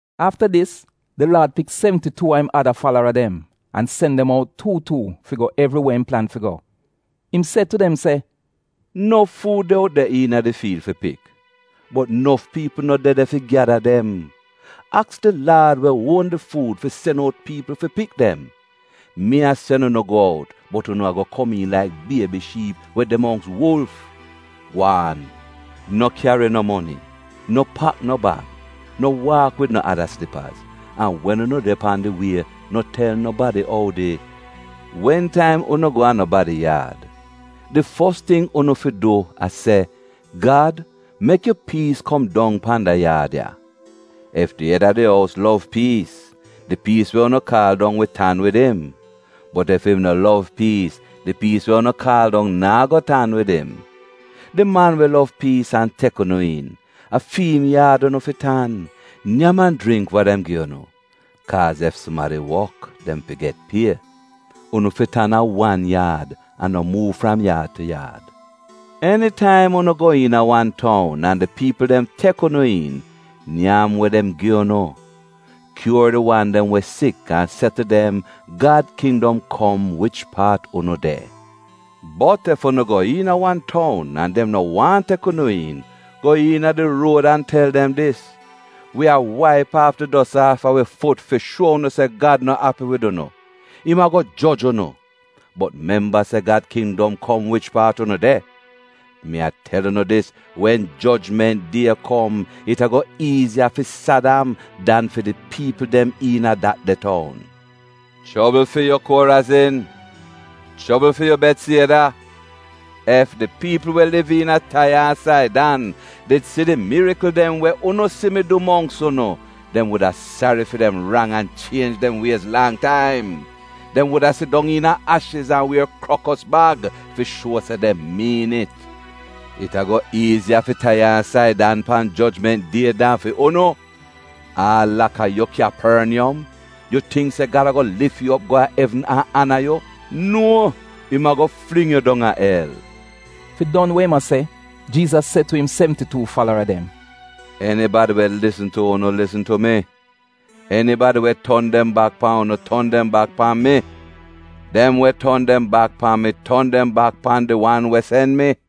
Afta dis, di Laad pik sevnti-tuu a im ada falara dem an sen dem out tuu tuu, fi go evriwe im plan fi go. Im se tu dem se, “Nof fuud de out de iina di fiil fi pik, bot nof piipl no de de fi gyada dem. Aks di Laad we uon di fuud fi sen out piipl fi pik dem. Mi a sen unu go out bot unu a-go komiin laik biebi shiip we de mongks wulf. Gwaan! No kyari no moni, no pak no bag, no waak wid no ada slipaz an wen unu de pan unu wie no tel nobadi oudi. “Wen taim unu go a nobadi yaad, di fos ting unu fi du a se, ‘Gad, mek yu piis kom dong pan da yaad ya.’ Ef di ed a di ous lov piis, di piis we unu kaal dong wi tan wid im, bot ef im no lov piis, di piis we unu kaal dong naa go tan wid im. Di man we lov piis an tek unu iin, a fi'im yaad unu fi tan. Nyam an jringk wa dem gi unu, kaaz ef sumadi wok dem fi get pie. Unu fi tan a wan yaad an no muuv fram yaad tu yaad. “Enitaim unu go iina wan toun an di piipl dem tek unu iin, nyam we dem gi unu. Kyuor di wan dem we sik an se tu dem, ‘Gad kindom kom wich paat unu de.’ Bot ef unu go iina wan toun an dem no waahn tek unu iin, go iina di ruod an tel dem dis, ‘Wi a waip aaf di dos aafa wi fut fi shuo unu se Gad no api wid unu — im a-go joj unu. Bot memba se Gad kindom kom wich paat unu de.’ Mi a tel unu dis, wen jojment die kom, it a-go iiziya fi Sadam dan fi di piipl dem iina dat de toun. “Chobl fi yu, Korazin! Chobl fi yu Betsieda! Ef di piipl we liv iina Taiya an Saidan did si di mirikl dem we unu si mi du mongks unu, dem wuda sari fi dem rang an chienj dem wiez lang taim. Dem wuda sidong iina ashiz an wier krokos bag fi shuo se dem miin it. It a-go iiziya fi Taiya an Saidan pan jojment die dan fi unu. Aal laka yu Kyaporniyom, yu tingk se Gad a-go lif yu op go a evn an ana yu? Nuo, im a-go fling yu dong a el.” Fi don we im a se, Jiizas se tu im sevnti-tuu falara dem, “Enibadi we lisn tu unu lisn tu mi. Enibadi we ton dem bak pan unu, ton dem bak pan mi. Dem we ton dem bak pan mi ton dem bak pan di wan we sen mi.”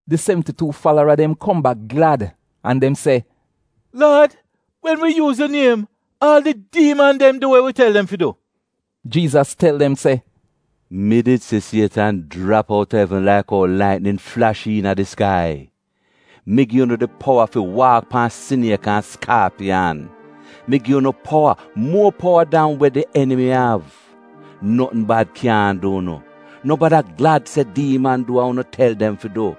Di sevnti-tuu falara dem kom bak glad an dem se, “Laad, wen wi yuuz yu niem, aal di diiman dem du wa wi tel dem fi du.” Jiizas tel dem se, “Mi did si Sietan jrap outa evn laik ou laitnin flash iina di skai. Mi gi unu di powa fi waak pan siniek an skaapiyan. Mi gi unu powa, muor powa dan we di enimi av. Notn bad kyaahn du unu. No bada glad se diiman du we unu tel dem fi du.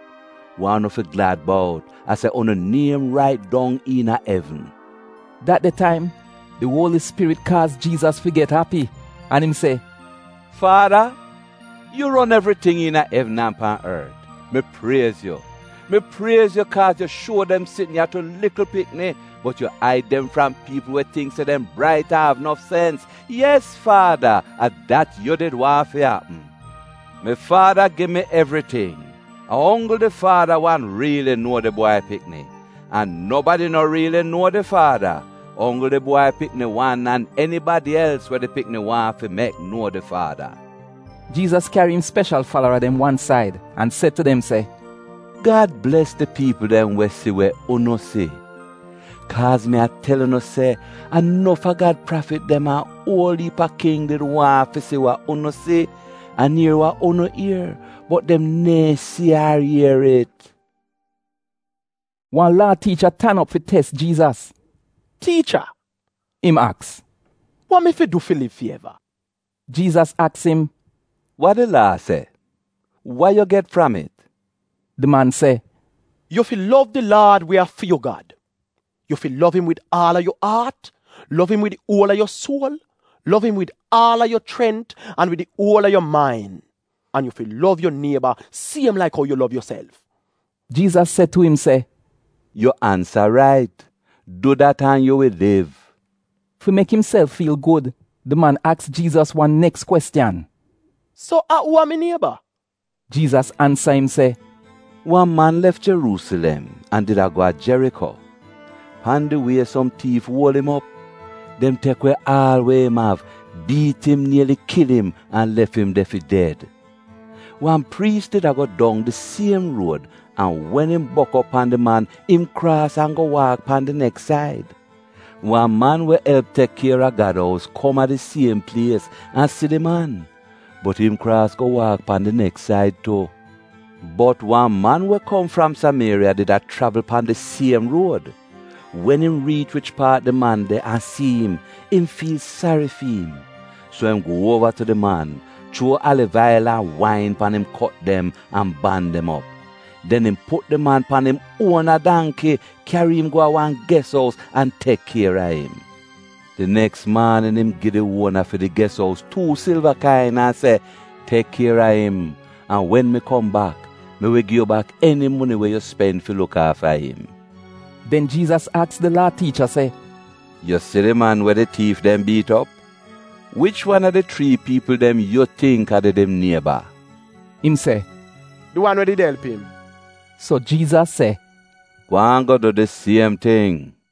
Wa unu fi glad bout a se unu niem rait dong iina evn.” Dat de taim, di Uoli Spirit kaaz Jiizas fi get api an im se, “Faada, yu ron evriting iina evn an pan ort, mi priez yu. Mi priez yu kaaz yu a shuo dem sitn ya tu likl pikni bot yu aid dem fram piipl we tingk se dem brait an av nof sens. Yes Faada, a dat yu did waahn fi apm. “Mi Faada gi mi evriting. A onggl di Faada wan riili nuo di Bwai Pikni. An nobadi no riili nuo di Faada, onggl di Bwai Pikni wan an enibadi els we di pikni waahn fi mek nuo di Faada.” Jiizas kyari im speshal falara dem wan said an se tu dem se, “Gad bles di piipl dem we si we unu si. Kaaz mi a tel unu se a nof a Gad prafit dem an uol iip a king did waahn fi si wa unu si, an ier wa unu ier, bot dem neehn si ar ier it.” Wan Laa tiicha tan op fi tes Jiizas. “Tiicha,” im aks, “Wa mi fi du fi liv fi eva?” Jiizas aks im, “Wa di Laa se? Wa yu get fram it?” Di man se, “ ‘Yu fi lov di Laad we a fi yu Gad. Yu fi lov im wid aal a yu aat, lov im wid di uol a yu suol, lov im wid aal a yu chrent an wid di uol a yu main,’ an, ‘yu fi lov yu nieba siem laik ou yu lov yuself.’” Jiizas se tu im se, “Yu ansa rait. Du dat an yu wi liv.” Fi mek imself fiil gud di man aks Jiizas wan neks kwestiyan, “So, a uu a mi nieba?” Jiizas ansa im se, “Wan man lef Jeruusilem an did a go a Jeriko. Pan di wie som tiif uol im op. Dem tek we aal we im av, biit im nieli kil im an lef im de fi ded. Wan priis did a go dong di siem ruod an wen im bok op pan di man, im kraas an go waak pan di neks said. Wan man we elp tek kier a Gad ous kom a di siem plies an si di man, bot im kraas go waak pan di neks said tu. Bot wan man we kom fram Samieriya did a chravl pan di siem ruod. Wen im riich wich paat di man de an si im, im fiil sari fi im. So, im gu uova tu di man, chuo aliv ail an wain pan im kot dem an ban dem op. Den im put di man pan im uona dangki, kyari im go a wan ges ous an tek kier a im. Di neks maanin im gi di uona fi di ges ous tuu silva kain, an se, ‘Tek kier a im, an wen mi kom bak, mi wi gi yu bak eni moni we yu spen fi luk aafa im.’” Den Jiizas aks di Laa tiicha se, “Yu si di man we di tiif dem biit op, wich wan a di chrii piipl dem yu tingk a did im nieba?” Im se, “Di wan we did elp im.” So Jiizas se, “Gwaan go du di siem ting.”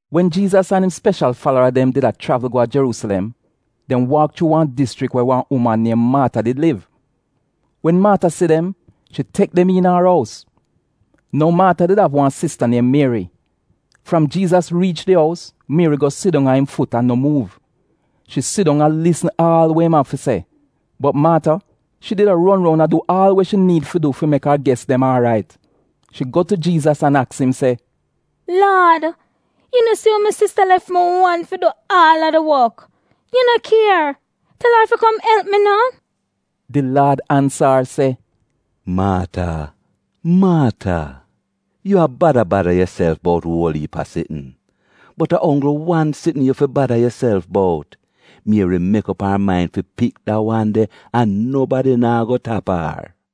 Wen Jiizas an im speshal falara dem did a chravl go a Jeruusilem, dem waak chuu wan dischrik we wan uman niem Maata did liv. Wen Maata si dem, shi tek dem iina ar ous. Nou, Maata did av wan sista niem Mieri. Fram Jiizas riich a di ous, Mieri go sidong a im fut an no muuv. Shi sidong a lisn aal we im av fi se. Bot Maata, shi did a ron roun a du aal we shi niid fi du fi mek ar ges dem aarait. Shi go tu Jiizas an aks im se, “Laad, yu no si ou mi sista lef mi wan fi du aal a di wok? Yu no kier? Tel ar fi kom elp mi no!” Di Laad ansa ar se, “Maata, Maata, yu a bada bada yuself bout uol iip a sitn, bot a onggl wan sitn yu fi bada yuself bout. Mieri mek op ar main fi pik da wan de an nobadi naa go tap ar.”